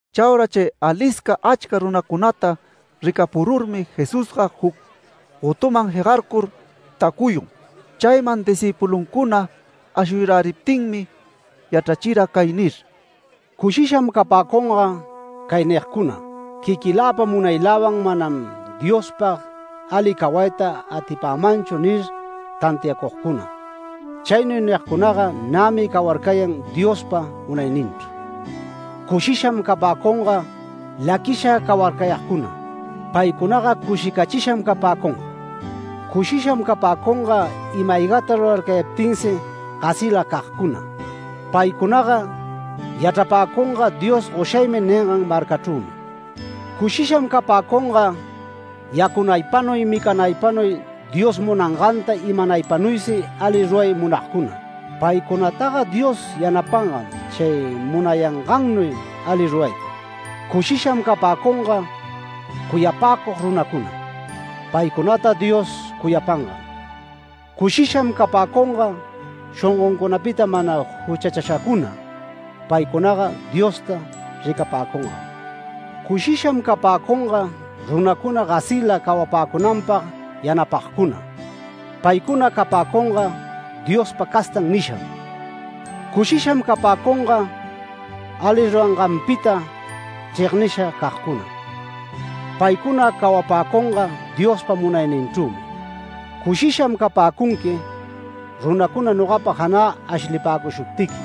Chaura chay alisca achca runacunata ricapururmi, Jesusga juc gotuman jegarcur tacuyun. Chayman discïpuluncuna ashuyaräriptinmi, yachrachira cay nir: “Cushisham capäcunga cay nigcuna: ‘Quiquiläpa munayläwan manam Diospag ali cawayta atipämanchu’ nir tantiacugcuna. Chaynuy nigcunaga nämi cawarcayan Diospa munayninchru. Cushisham capäcunga laquisha cawarcayagcuna. Paycunaga cushicachisham capäcunga. Cushisham capäcunga ima-aygata rurarcayaptinsi gasilacagcuna. Paycunaga yachrapäcunga ‘Dios goshagmi’ ningan marcachrümi. Cushisham capäcunga yacunaypanuy micanaypanuy Dios munanganta imanaypanuysi ali ruray munagcuna. Paycunataga Dios yanapangam chay munayangannuy ali rurayta. Cushisham capäcunga cuyapäcug runacuna. Paycunata Dios cuyapangam. Cushisham capäcunga shongoncunapita mana juchachashacuna. Paycunaga Diosta ricapäcungam. Cushisham capäcunga runacuna gasila cawapäcunanpag yanapagcuna. Paycuna capäcunga ‘Diospa castan’ nisham. Cushisham capäcunga ali ruranganpita chregnisha cagcuna. Paycuna cawapäcunga Diospa munayninchrümi. Cushisham capäcunqui, runacuna nogapa janä ashlipäcushuptiqui,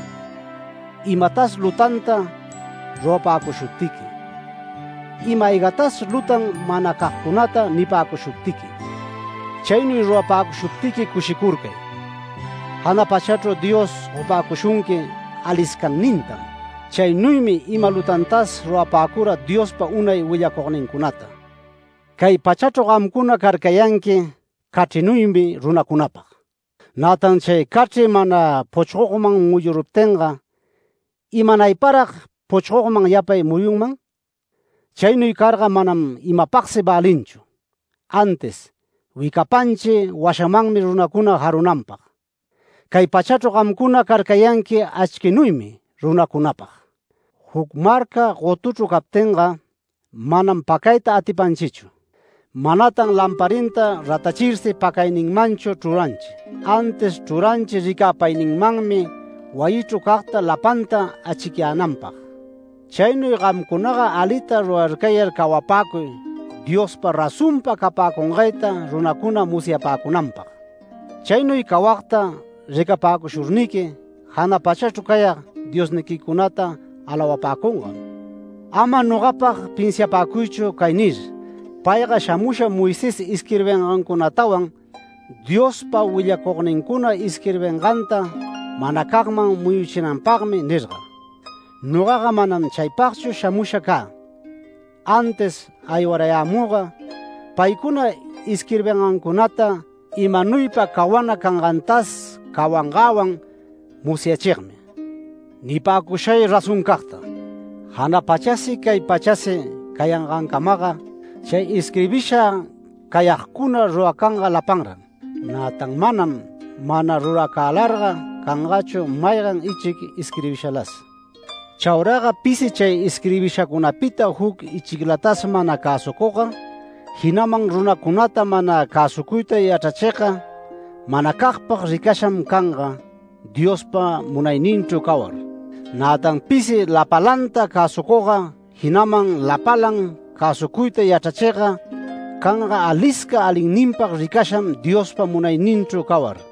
imatas lutanta rurapäcushuptiqui, ima-aygatas lutan manacagcunata nipäcushuptiqui. Chaynuy rurapäcushuptiqui cushicurcay, jana pachachru Dios gopäcushunqui aliscannintam. Chaynuymi ima lutantas rurapäcura Diospa unay willacugnincunata”. “Cay pachachru gamcuna carcayanqui cachrinuymi runacunapag. Nätan chay cachri mana puchgogman muyuruptinga ¿imanayparag puchgogman yapay muyunman? Chaynuy carga manam imapagsi välinchu, antis wicapanchi washamanmi runacuna jarunanpag. Cay pachachru gamcuna carcayanqui achquinuymi runacunapag. Juc marca gotuchru captinga, manam pacayta atipanchichu. Manatan lamparinta ratachirsi pacayninmanchu chruranchi, antis chruranchi ricäpayninmanmi wayichru cagta lapanta achicyänanpag. Chaynuy gamcunaga alita rurarcayar cawapäcuy Diospa razonpa capäcungayta runacuna musyapäcunanpag. Chaynuy cawagta ricapäcushurniqui jana pachachru cayag Diosniquicunata alawapäcungam”. “Ama nogapag pinsiapäcuychu cay nir: ‘Payga shamusha Moisés isquirbingancunatawan Diospa willacugnincuna isquirbinganta manacagman muyuchinanpagmi’ nirga. Nogaga manam chaypagchu shamusha cä, antis aywarayämüga paycuna isquirbingancunata imanuypa cawana cangantas cawangäwan musyachigmi. Nipäcushay razoncagta: Jana pachasi cay pachasi cayangancamaga chay isquirbisha cayagcuna ruracanga lapanran. Nätan manam, mana ruracälarga canganchu maygan ichic isquirbishalas. Chauraga pisi chay isquirbishacunapita juc ichiclatas mana cäsucugga, jinaman runacunata mana cäsucuyta yachrachigga, manacagpag ricasham canga, Diospa munayninchru cawar. Nätan pisi lapalanta cäsucugga, jinaman lapalan cäsucuyta yachrachigga, canga alisca alinninpag ricasham Diospa munayninchru cawar.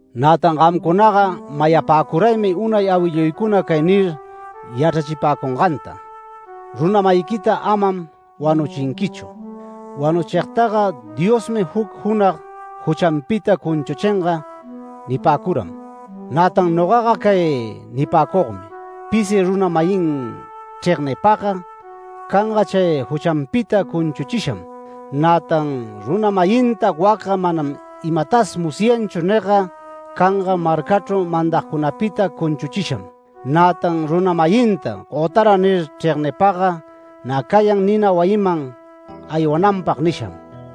“Nätan gamcunaga mayapäcuraymi unay awilluycuna cay nir yachrachipäcunganta: ‘Runa-mayiquita amam wanuchinquichu. Wanuchigtaga Diosmi juc junag juchanpita cunchuchinga’ nipäcuram. Nätan nogaga cay nipäcugmi: Pisi runa-mayin chregnipagga canga chay juchanpita cunchuchisham. Nätan runa-mayinta ‘Wacga manam imatas musyanchu’ nigga canga marcachru mandagcunapita cunchuchisham. Nätan runa-mayinta ‘Gotara’ nir chregnipagga nä cayan nina wayiman aywananpag nisham.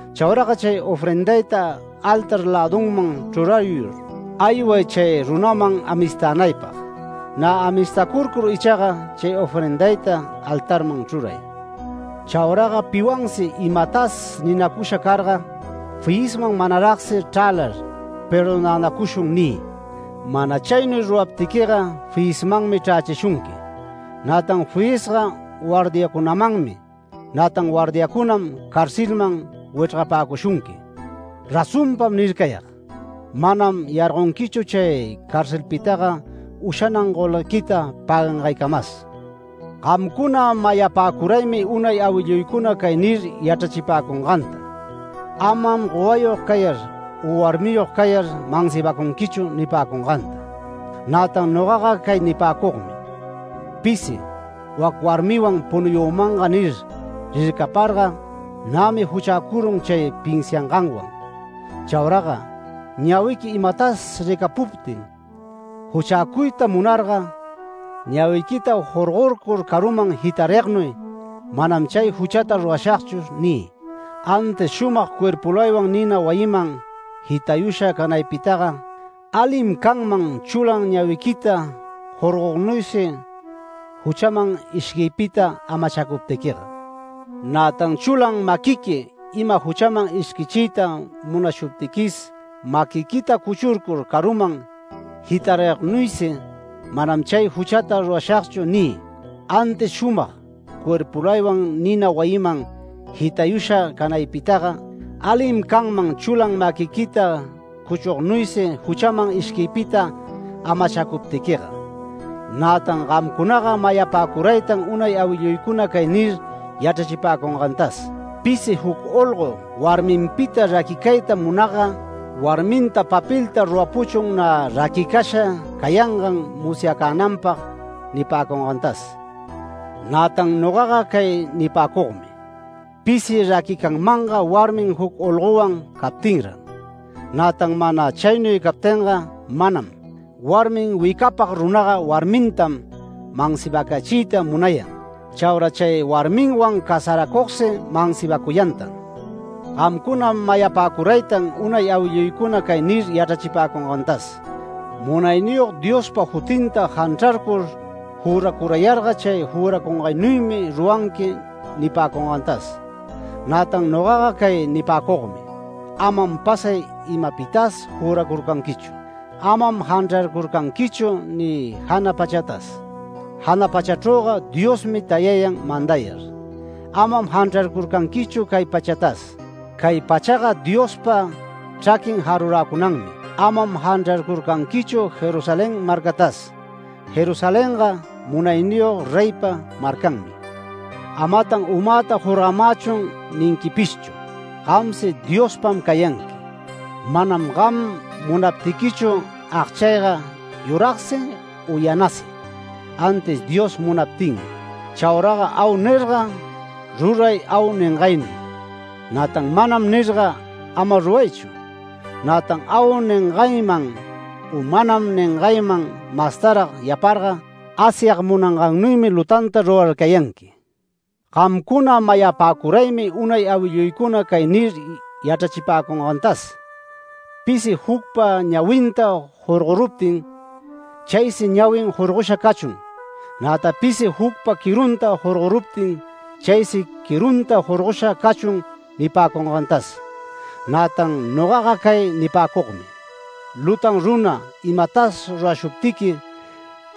Chauraga chay ofrendayta altar lädunman chrurayur, ayway chay runaman amistänaypag. Nä amistacurcur ichaga, chay ofrendayta altarman chruray. Chauraga piwansi imatas ninacusha carga, fiyisman manaragsi chrälar ‘Perdonänacushun’ niy. Mana chaynuy ruraptiquiga fiyismanmi chrächishunqui; nätan fiyisga guardiacunamanmi. Nätan guardiacunam carcelman wichrgapäcushunqui. Razonpam nircayag: Manam yargonquichu chay carcelpitaga ushanan golguequita pägangaycamas”. “Gamcuna mayapäcuraymi unay awilluycuna cay nir yachrachipäcunganta: ‘Amam gowayog cayar u warmiyog cayar mansibacunquichu’ nipäcunganta. Nätan nogaga cay nipäcugmi: Pisi ‘Wac warmiwan punuyümanga’ nir rircaparga, nämi juchäcurun chay pinsianganwan. Chauraga ñawiqui imatas ricapuptin juchäcuyta munarga, ñawiquita jorgorcur caruman jitarignuy ‘Manam chay juchata rurashagchu’ niy. Antis shumag cuerpulaywan nina wayinman jitayusha canaypitaga, alim canman chulan ñawiquita jorgognuysi juchaman ishquiypita amachacuptiquiga. Nätan chulan maquiqui ima juchaman ishquichiyta munashuptiquis maquiquita cuchurcur caruman jitarignuysi ‘Manam chay juchata rurashagchu’ niy. Antis shumag cuerpulaywan nina wayiman jitayusha canaypitaga, alim canman chulan maquiquita cuchugnuysi juchaman ishquiypita amachacuptiquiga. Nätan gamcunaga mayapäcuraytan unay awilluycuna cay nir yachrachipäcungantas: ‘Pisi juc olgo warminpita raquicayta munagga, warminta papelta rurapuchun nä raquicasha cayangan musyacänanpag’ nipäcungantas. Nätan nogaga cay nipäcugmi: Pisi raquicanmanga warmin juc olgowan captinran, nätan mana chaynuy captinga manam. Warmin wicapag runaga warmitam mansibacachiyta munayan. Chaura chay warmiwan casaracugsi mansibacuyantan”. “Gamcuna mayapäcuraytan unay awilluycuna cay ni yachrachipäcungantas: ‘Munayniyog Diospa jutinta janchrarcur juracurayarga chay juracungaynuymi ruranqui’ nipäcungantas. Nätan nogaga cay nipäcugmi: Amam pasay imapitas juracurcanquichu. Amam janchrarcurcanquichu ni jana pachatas. Jana pachachrüga Diosmi tayayan mandayar. Amam janchrarcurcanquichu cay pachatas. Cay pachaga Diospa chraquin jaruräcunanmi. Amam janchrarcurcanquichu Jerusalén marcatas. Jerusalenga munayniyog reypa marcanmi. Amatan ‘Umäta jorgamächun’ ninquipishchu. Gamsi Diospam cayanqui. Manam gam munaptiquichu agchayga yuragsi u yanasi antis Dios munaptinmi. Chauraga ‘Au’ nirga, ruray ‘Au’ ningaynuy; nätan ‘Manam’ nirga, ama ruraychu. Nätan ‘Au’ ningayman u ‘Manam’ ningayman mastarag yaparga, Asyag munangaynuymi lutanta rurarcayanqui”. “Gamcuna mayapäcuraymi unay awilluycuna cay nir yachrachipäcungantas: ‘Pisi jucpa ñawinta jorgoruptin, chaysi ñawin jorgosha cachun. Nätan pisi jucpa quirunta jorgoruptin, chaysi quirunta jorgosha cachun’ nipäcungantas. Nätan nogaga cay nipäcugmi: Lutan runa imatas rurashuptiqui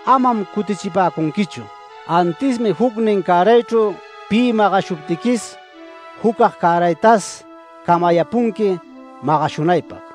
amam cutichipäcunquichu. Antismi jucnin cäraychru pi magashuptiquis, jucag cäraytas camayäpunqui magashunaypag.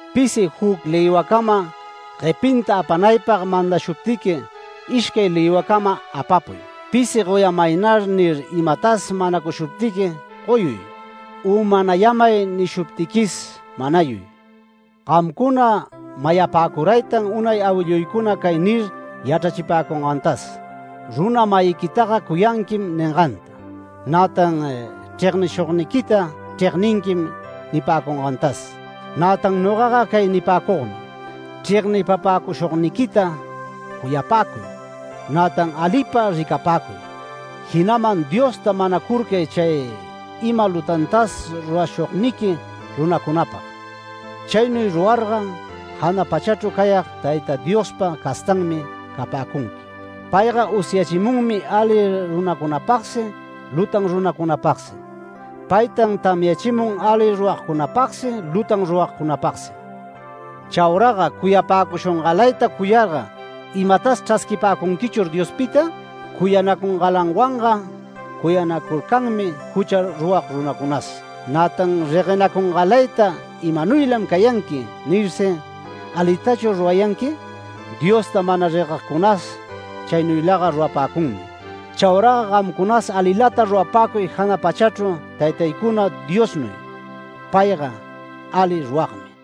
Pisi juc lïwacama guepinta apanaypag mandashuptiqui, ishcay lïwacama apapuy. Pisi ‘Goyamaynar’ nir imatas manacushuptiqui, goyuy; u ‘Manayämay’ nishuptiquis, manayuy”. “Gamcuna mayapäcuraytan unay awilluycuna cay nir yachrachipäcungantas: ‘Runa-mayiquitaga cuyanquim’ ninganta. Nätan ‘Chregnishugniquita chregninquim’ nipäcungantas. [Nätan nogaga cay nipäcugmi: Chregnipapäcushugniquita cuyapäcuy, nätan alipa ricapäcuy. Jinaman Diosta manacurcay chay ima lutantas rurashugniqui runacunapag.] Chaynuy rurarga jana pachachru cayag Tayta Diospa castanmi capäcunqui. Payga usyachimunmi ali runacunapagsi lutan runacunapagsi. Paytan tamyachimun ali rurag ruragcunapagsi lutan ruragcunapagsi. Chauraga cuyapäcushungalayta cuyarga ¿imatas chrasquipäcunquichur Diospita? Cuyanacungalanwanga cuyanacurcanmi jucha rurag runacunas. Nätan reguenacungalayta ‘¿Imanuylam cayanqui?’ nirsi ¿alitachur rurayanqui? Diosta mana reguegcunas chaynuylaga rurapäcunmi. Chauraga gamcunas alilata rurapäcuy jana pachachru Taytaycuna Diosnuy, payga ali ruragmi”.